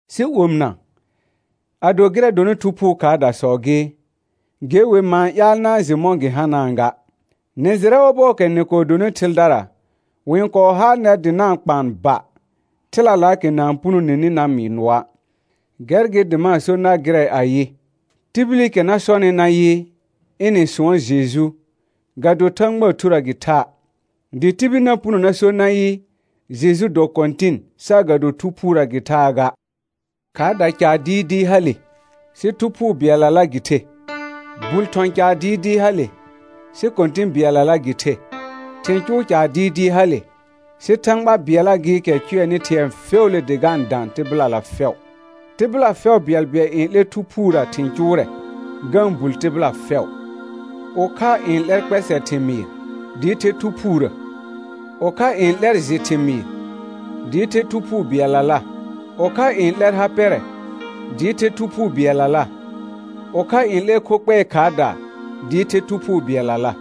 Sɩ omɩna, ado gɩrɛ dɔnɩ Thu Phuu khaardasɔ gɩ, ge wer ma-n ƴaal na-n jɩ mɔ̃ gɩ hanaa ga. Nɩ jɩrɛ ɔbɔɔkɛ nɩ kɔɔ donɩ thɩldara, wɩ-n kɔɔ haal nɛr dɩ na-n kpaan ba, thɩlalaakɛ na-n punoneni na mɩɩ nʋɔa'. Gɛr gɩ dɩ ma-n so nar gɩrɛ ayɩ: Tibilikɛ na sɔnɩ nayɩ, ɩnɩ sʋɔn Jeju, ga do Thãgbaa Thurə gɩ tha'; dɩ tibil na puno na so nayɩ: Jeju dɔ Kɔ̃tɩn, saagado Thu Phuurə gɩ thaa ga. Khaarda caar dɩɩdɩɩ hale, sɩ Thu Phuu bɩɛllala gɩ the. Bul thɔ̃ caar dɩɩdɩɩ hale, sɩ Kɔ̃tɩ̃ bɩɛllala gɩ the. Thɩ̃ cʋʋ caar dɩɩdɩɩ hale, sɩ Thãgba bɩɛlla gɩɩkɛ n cʋɛnɩ thɩ̃ɛ fɛʋʋle dɩ ga-n dã tɩbɩlala fɛʋ. Tɩbɩla fɛʋ bɩɛlbɩɛl n 'lɛr Thu Phuurə thɩ̃ cʋʋrɛ, ga-n bul tɩbɩla fɛʋ. Ʋkha n 'lɛr kpɛsɛ thɩmɩɩr, dɩɩ the Thu Phuurə, ʋkha n 'lɛr jɩ thɩmɩɩr, dɩɩ the Thu Phuu bɩɛllala. Ʋkha n 'lɛr ha pɛrɛ, dɩɩ the Thu Phuu bɩɛllala, ʋkha n 'lɛr kho kpɛɛ khaardaa, dɩɩ the Thu Phuu bɩɛllala.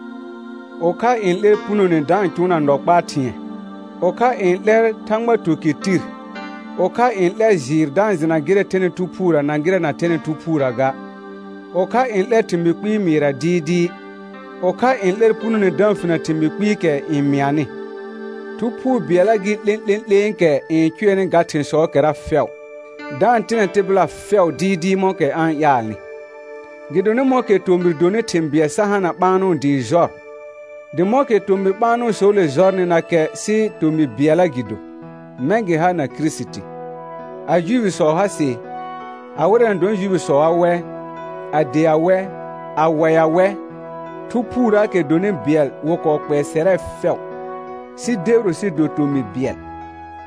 Ʋkha n 'lɛr punone da-n cʋʋna nɔ kpaa thɩ̃ɛ; ʋkha n 'lɛr Thãgba tukɩr tir; ʋkha n 'lɛr jɩɩr da-n jɩna gɩrɛ thɛnɩ Thu Phuurə na gɩrɛ na thɛnɩ Thu Phuurə ga; ʋkha n 'lɛr thɩmɩɩ kpɩɩ mɩɩrɛ dɩɩdɩɩ; ʋkha n 'lɛr punone da-n finə thɩmɩɩ kpɩɩkɛ n mɩanɩ. Thu Phuu bɩɛlla gɩ 'lẽ'lẽ'lẽekɛ n cʋɛnɩ ga thɩ̃sɔɔkɛra fɛʋ, da-n tɩnɛ tɩbɩla fɛʋ dɩɩdɩɩ mɔ̃kɛ a-n ƴaalnɩ. Gɩdonɩ mɔ̃kɛ tomɩr donɩ thɩ̃ bɩɛl sa hana ɓaanʋ dɩɩ jɔr, dɩ mɔ̃kɛ tomɩ ɓaanʋsɔɔle jɔrnɩnakɛ sɩ tomɩ bɩɛlla gɩ do, mɛ̃ gɩ ha na Kirisiti. A Juifisɔ ha sɩ, a wɩrɛ na dɔnɩ Juifisɔa wɛ, a dea wɛ, a waɩa wɛ, Thu Phuurəəkɛ dɔnɩ bɩɛl wɩ kɔɔ kpɛɛ sɛrɛ fɛʋ, sɩ debiro sɩ do tomɩ bɩɛl,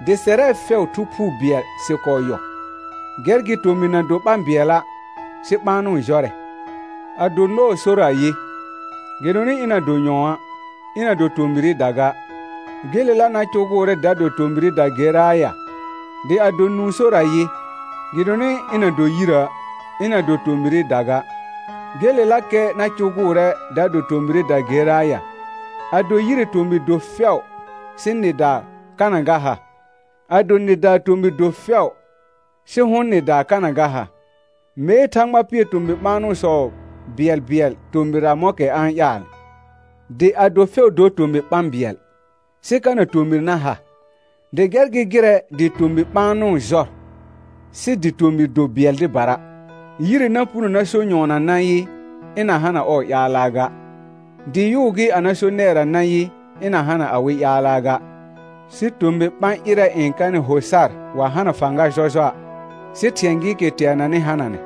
dɩ sɛrɛ fɛʋ Thu Phuu bɩɛl sɩ kɔɔ yɔ. Gɛr gɩ tomɩr na do ɓã bɩɛla', sɩ ɓaanʋ jɔrɛ. Ado nɔɔ sor ayɩ, gɩdonɩ ɩna do nyɔ̃a', ɩna do tomɩrɩda ga, gelelakɛ na cʋgʋʋrɛ da do tomɩrɩda geraa ya? Dɩ ado nũu sor ayɩ, gɩdonɩ ɩna do yirə', ɩna do tomɩrɩda ga, gelelakɛ na cʋgʋʋrɛ da do tomɩrɩda geraa ya? Ado yire tomɩr do fɛʋ, sɩ nɩdaa kana ga ha? Ado nɩdaa tomɩr do fɛʋ, sɩ hʋ̃ nɩdaa kana ga ha? Mee Thãgba pɩɛr tomɩ ɓaanʋsɔ bɩɛlbɩɛl tomɩrra mɔ̃kɛ a-n ƴaalnɩ. Dɩ ado fɛʋ dor tomɩ ɓã bɩɛl, sɩ kana tomɩr na ha? Gɛr gɩ gɩrɛ dɩ tomɩ ɓaanʋ jɔr, sɩ dɩ tomɩr do bɩɛl dɩbara. Yire na puno na so nyɔɔna nayɩ, ɩna hana ɔɔ ƴaalaa ga; dɩ yʋʋ gɩ a na so nɛɛra nayɩ, ɩna hana awɩ ƴaalaa ga. Sɩ tomɩ ɓã ƴɩrɛ n kanɩ ho sar wa hana fãga jɔjɔa', sɩ thɩ̃ɛ gɩɩkɛ teananɩ hananɛ.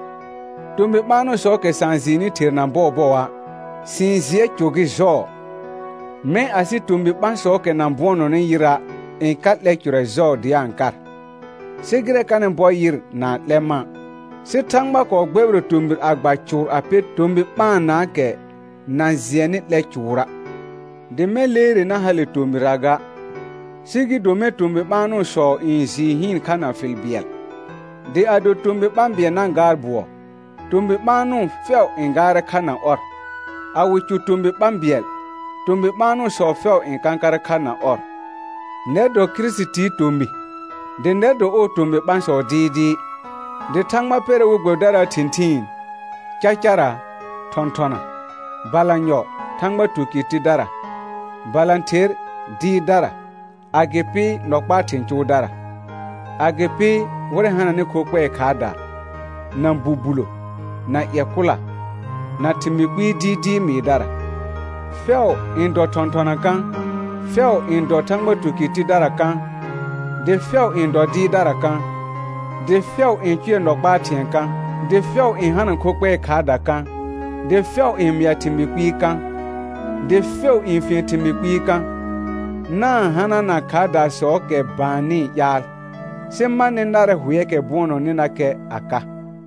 Tomɩ ɓaanʋsɔɔkɛ sa-n jɩɩnɩ therna bɔɔbɔa', sɩ-n jɩɛ cʋ gɩ jɔɔ; mɛ̃ asɩ tomɩ ɓãsɔɔkɛ na bʋɔnɔnɩ yɩra' n ka 'lɛ cʋrɛ jɔɔ dɩ a-n kar. Sɩ gɩrɛ kanɩ bɔr yɩr na-n 'lɛ mã'. Sɩ Thãgba kɔɔ gbɛbɩrɛ tomɩr a gba cʋʋr a pɛr tomɩ ɓaanaakɛ na jɩɛnɩ 'lɛ cʋʋra', dɩ mɛ̃ leere na hale tomtrra ga, sɩ gɩ do mɛ̃ tomɩ ɓaanʋsɔ n jɩɩ hɩɩn kha na fɩl bɩɛl. Dɩ ado tomɩ ɓã bɩɛl na gaar bʋɔ, tomɩ ɓaanʋ fɛʋ n gaarɛ kha na ɔr, a wɩ cʋ tomɩ ɓã bɩɛl, tomɩ ɓaanʋsɔ fɛʋ n kãkarɛ kha na ɔr. Nɛr dɔ Kirisitii tomɩ, dɩ nɛr dɔ ɔɔ tomɩ ɓãsɔ dɩɩdɩɩ. Dɩ Thãgba pɛrɛ we gbɛbɩdaraa thɩ̃thɩɩn: Cacara, thɔ̃thɔna; balanyɔ, Thãgba tukɩr tidara; balãther, dɩɩrdara; agɩpɩ, nɔ kpaa thɩ̃ cʋʋdara; agɩpɩ, wɩrɛ hananɩ kho kpɛɛ khaardaa, na bubulo, na ƴɛ kʋla, na thɩmɩɩ kpɩɩ dɩɩdɩɩ mɩɩdara. Fɛʋ n dɔ thɔ̃thɔna kã? Fɛʋ n dɔ Thãgba tukɩr tidara kã? Dɩ fɛʋ n dɔ dɩɩrdara kã? Dɩ fɛʋ n cʋɛ nɔ kpaa thɩ̃ɛ kã? Dɩ fɛʋ n hana kho kpɛɛ khaardaa kã? Dɩ fɛʋ n mɩa thɩmɩɩ kpɩɩ kã? Dɩ fɛʋ n fien thɩmɩɩ kpɩɩ kã? Na-n hanana khaardaasɔɔkɛ baannɩɩ ƴaal; sɩ ma nɩ narɛ hʋɛɛkɛ bʋɔnɔnɩnakɛ a ka.